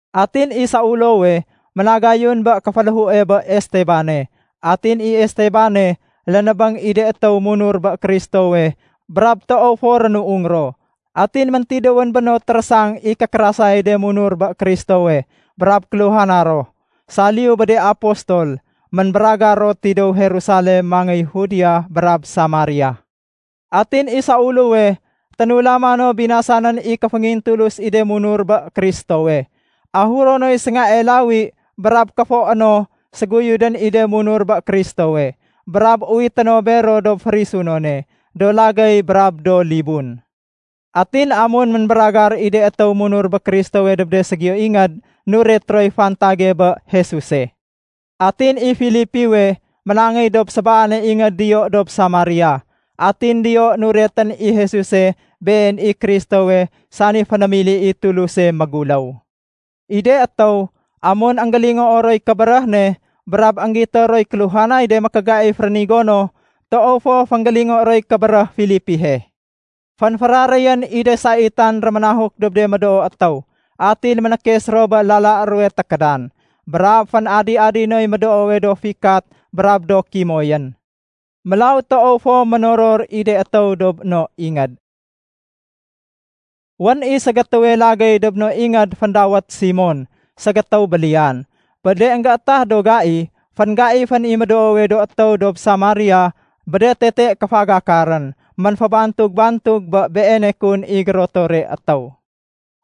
Atin i Saulowe ménagayun bé kéféléhue bé Estebane. Atin i Estebane, lénébéng i de étéw munur bé Kristowe brab toow fo rénuung ro. Atin méntidéwén bé no térésang i kékérasayay de munur bé Kristowe. Brab kéluhana ro, saliyu bé de apostol, ménbéragar ro tidéw Jerusalem mangéy Judia brab Samaria. Atin i Saulowe ténulama no binasanén i kéféngintulus i de munur bé Kristowe, ahuro noy séngae lawi brab kéfoé no séguyudén i de étéw munur bé Kristowe. Brab uwité no bero dob férisunone, do lagéy brab do libun. Atin amun ménbéragar i de étéw munur bé Kristowe dob de ségiyo ingéd, nuret roy fantage bé Jesuse. Atin i Filipiwe ménangéy dob sébaane ingéd diyo dob Samaria, atin diyo nuretén i Jesuse Been i Kristowe sani fénémili i Tuluse méguléw. I de étéw, amun énggélingoo roy kébéréh ne brab énggito roy kéluhanay de mékégaif rénigo no, toow fo fénggélingo roy kébéréh Filipihe. Fénféraréyén i de saitan réménahuk dob de médoo étéw, atin ménékes ro bé lala ruwe tékédan. Brab fén-adi-adi noy médoowe do fikat brab do kimoyén. Mélaw toow fo ménoror i de étéw dob no ingéd. Wén i ségétéwe lagéy dob no ingéd féndawét Simon, ségétéw béliyan. Bé de énggétah do gai, fénggaifén i médoowe do étéw dob Samaria bé de tete kéfagakarén. Ménfébantug-bantug bé beene kun i gérotore étéw.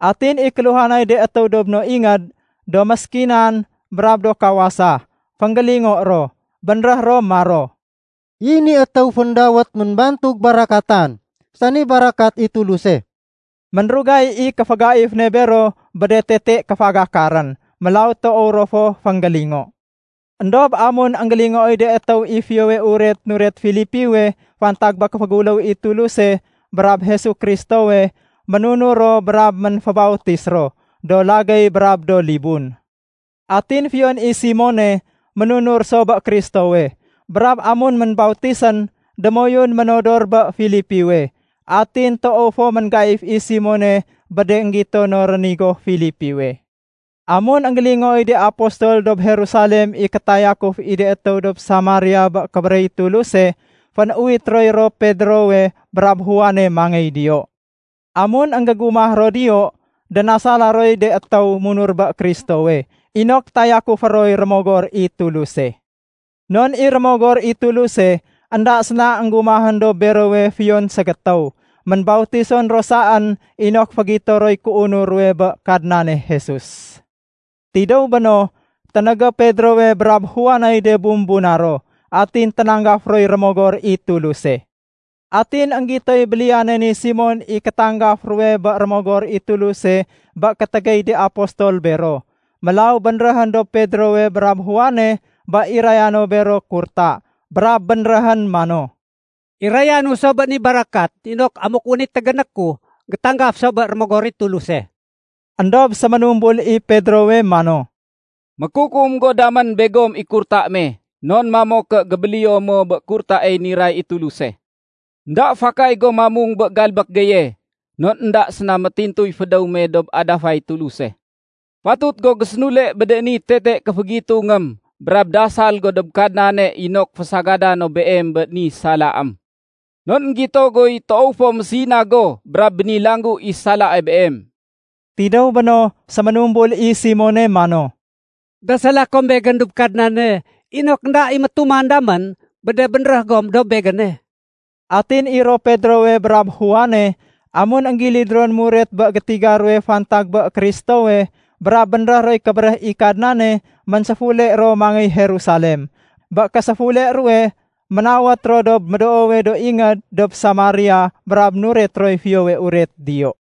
Atin i kéluhanay de étéw dob no ingéd do méskinan brab do kawasa, fénggélingo ro. Bénréh ro maro “I ni étéw féndawét Ménbantug Barakatan, sani barakat i Tuluse.” Ménrugay i kéfégaif ne bero bé de tete kéfagakarén. Mélaw toow ro fo fénggélingo. Endob amun énggélingooy de étéw i Fiyowe Uret nuret Filipiwe fantag bé kéféguléw i Tuluse brab Jesu Kristowe, ménunur ro brab ménfébautis ro, do lagéy brab do libun. Atin fiyon i Simone ménunur so bé Kristowe. Brab amun ménbautisén, démoyun ménodor bé Filipiwe. Atin toow fo ménggaif i Simone bé de énggito no rénigo Filipiwe. Amun énggélingooy de apostol dob Jerusalem i kétayakuf i de étéw dob Samaria bé kébéréh i Tuluse, fénuwit roy ro Pedrowe brab Juane mangéy diyo. Amun énggégumah ro diyo, dénasala roy de étéw munur bé Kristowe inok tayakufé roy Rémogor i Tuluse. Non i Rémogor i Tuluse, énda séna énggumahén dob berowe fiyon ségétéw. Ménbautison ro saén inok fégito roy kéunur ruwe bé Kadnane Jesus. Tidéw béno, ténégé Pedrowe brab Juaney de bumbuna ro. Atin ténanggaf roy Rémogor i Tuluse. Atin énggitoy béliyane ni Simon i kétanggaf ruwe bé Rémogor i Tuluse bé kétégéy de apostol bero. Mélaw bénréhén dob Pedrowe brab Juane bé iraya no bero kurta. Brab bénréhén mano, “Irayanu so bé ni barakat inok amuk wén i tégéné ku, gétanggaf so bé Rémogor i Tuluse.” Endob séménumbul i Pedrowe mano, “Mékukum go damén begom i kurta me, non mamo ké gébéléyo mo bé kurtaey niray i Tuluse. Enda fakay go mamung bé galbék geye non énda séna métintuy fédéw me dob adafay Tuluse. Fatut go gésénule bé ni tete kéfégitungém brab dasal go dob Kadnane inok fésagada no beem bé ni salaém. Non énggito guy toow fo mésina go brab bénilanggu i salae beem.” Tidéw béno, séménumbul i Simone mano, “Dasala kom begén dob Kadnane inok énda i métuman damén bé de bénréh gom dob begéne.” Atin i ro Pedrowe brab Juane, amun énggilid ron muret bé gétiga ruwe fantag bé Kristowe, brab bénréh roy kébéréh i Kadnane, ménséfule ro mangéy Jerusalem. Bé késéfule ruwe, ménawét ro dob médoowe do ingéd dob Samaria brab nuret roy Fiyowe Uret diyo.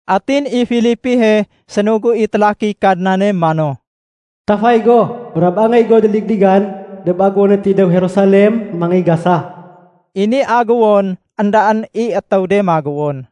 Atin i Filipihe, sénugu i télakiy Kadnane mano, “Tafay go brab angéy go déligdigan dob agéwone tidéw Jerusalem mangéy Gasa.” (I ni agéwon éndaén i étéw de magéwon.)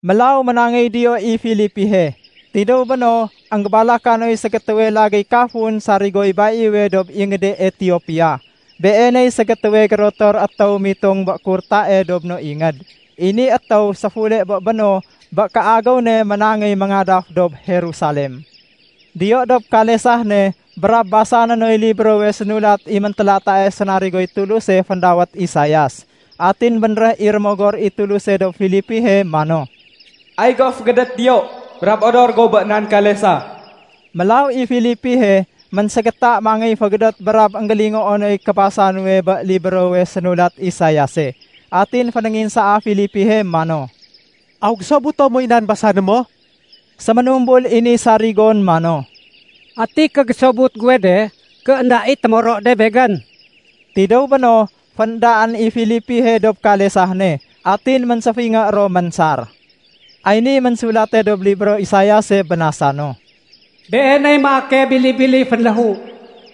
Mélaw ménangéy diyo i Filipihe. Tidéw béno, énggébalaka noy ségétéwe lagéy kafun sarigoy baiwe dob ingéde Etiopia. Beeney ségétéwe gérotor étéw mitong bé kurtae dob no ingéd. I ni étéw séfule bé béno bé kéagéw ne ménangéy méngadaf dob Jerusalem. Diyo dob kalesah ne brab basané noy librowe sénulat i méntélatae sénarigoy Tuluse féndawét Isaias. Atin bénréh i Rémogor i Tuluse dob Filipihe mano, “Ay go fégédét diyo brab odor go bé nan kalesah.” Mélaw i Filipihe ménségéta mangéy fégédét brab énggélingoo noy kébasa nuwe bé librowe sénulat Isaiase. Atin fénénginsaa Filipihe mano, “Aw gésobuto moy nan basané mo?” Séménumbul i ni sarigon mano, “Ati kégésobut guwe de ké énda i témoro de begén?” Tidéw béno, féndaén i Filipihe dob kalesah ne atin ménséfingé ro ménsar. Ay niy ménsulate dob libro Isaiase, bénasa no, “Beeney maake bili-bili fénléhu.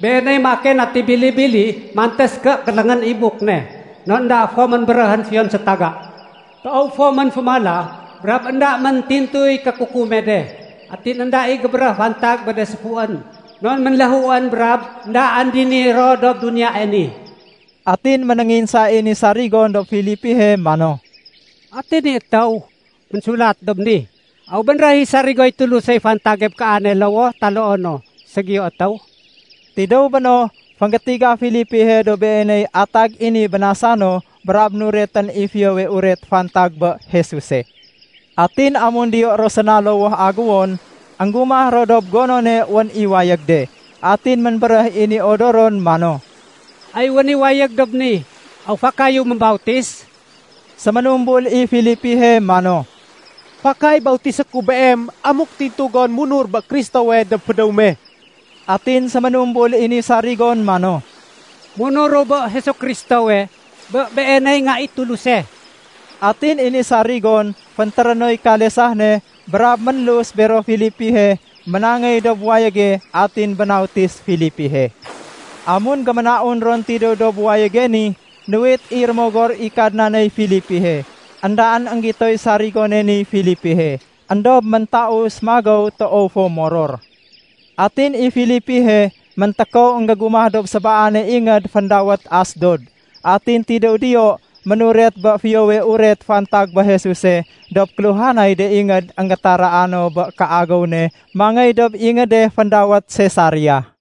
Beeney maake nati bili-bili mantés ké kéléngén i buk ne, non énda fo ménbéréhén fiyon sétaga. Toow fo ménfémala brab énda méntintuy kékukume de. Atin énda i gébéréh fantag bé de séfuén non ménléhuén brab éndaén dini ro dob duniyae ni.” Atin ménénginsa i ni sarigon dob Filipihe mano, “Ati ni étéw ménsulat dob ni? Aw bénréh i sarigoy Tulusey fantage bé kaane lowoh taloo no ségiyo étéw?” Tidéw béno, fénggétiga Filipihe dob beeney atag ni bénasa no brab nuretén i Fiyowe Uret fantag bé Jesuse. Atin amun diyo ro séna lowoh aguwon, énggumah ro dob gonone wén i wayég de. Atin ménbéréh i ni odoron mano, “Ay wén i wayég dob ni. Aw fakayu mébautis?” Séménumbul i Filipihe mano, “Fakay bautisé ku beem amuk tintu gon munur bé Kristowe dob fédéw me.” Atin séménumbul i ni sarigon mano, “Munuru bé Jesu Kristowe, bé Beeney Nga i Tuluse.” Atin i ni sarigon féntéré noy kalesah ne brab ménlus bero Filipihe ménangéy dob wayége atin bénautis Filipihe. Amun géménaun ron tidéw dob wayége ni, nuwit i Rémogor i Kadnaney Filipihe. Endaén énggitoy sarigone niy Filipihe, éndob méntaus magéw toow fo moror. Atin i Filipihe méntékow énggégumah dob sébaane ingéd féndawét Asdod. Atin tidéw diyo ménuret bé Fiyowe Uret fantag bé Jesuse dob kéluhanay de ingéd énggétaraa no bé kéagéw ne mangéy dob ingéde féndawét Sesaria.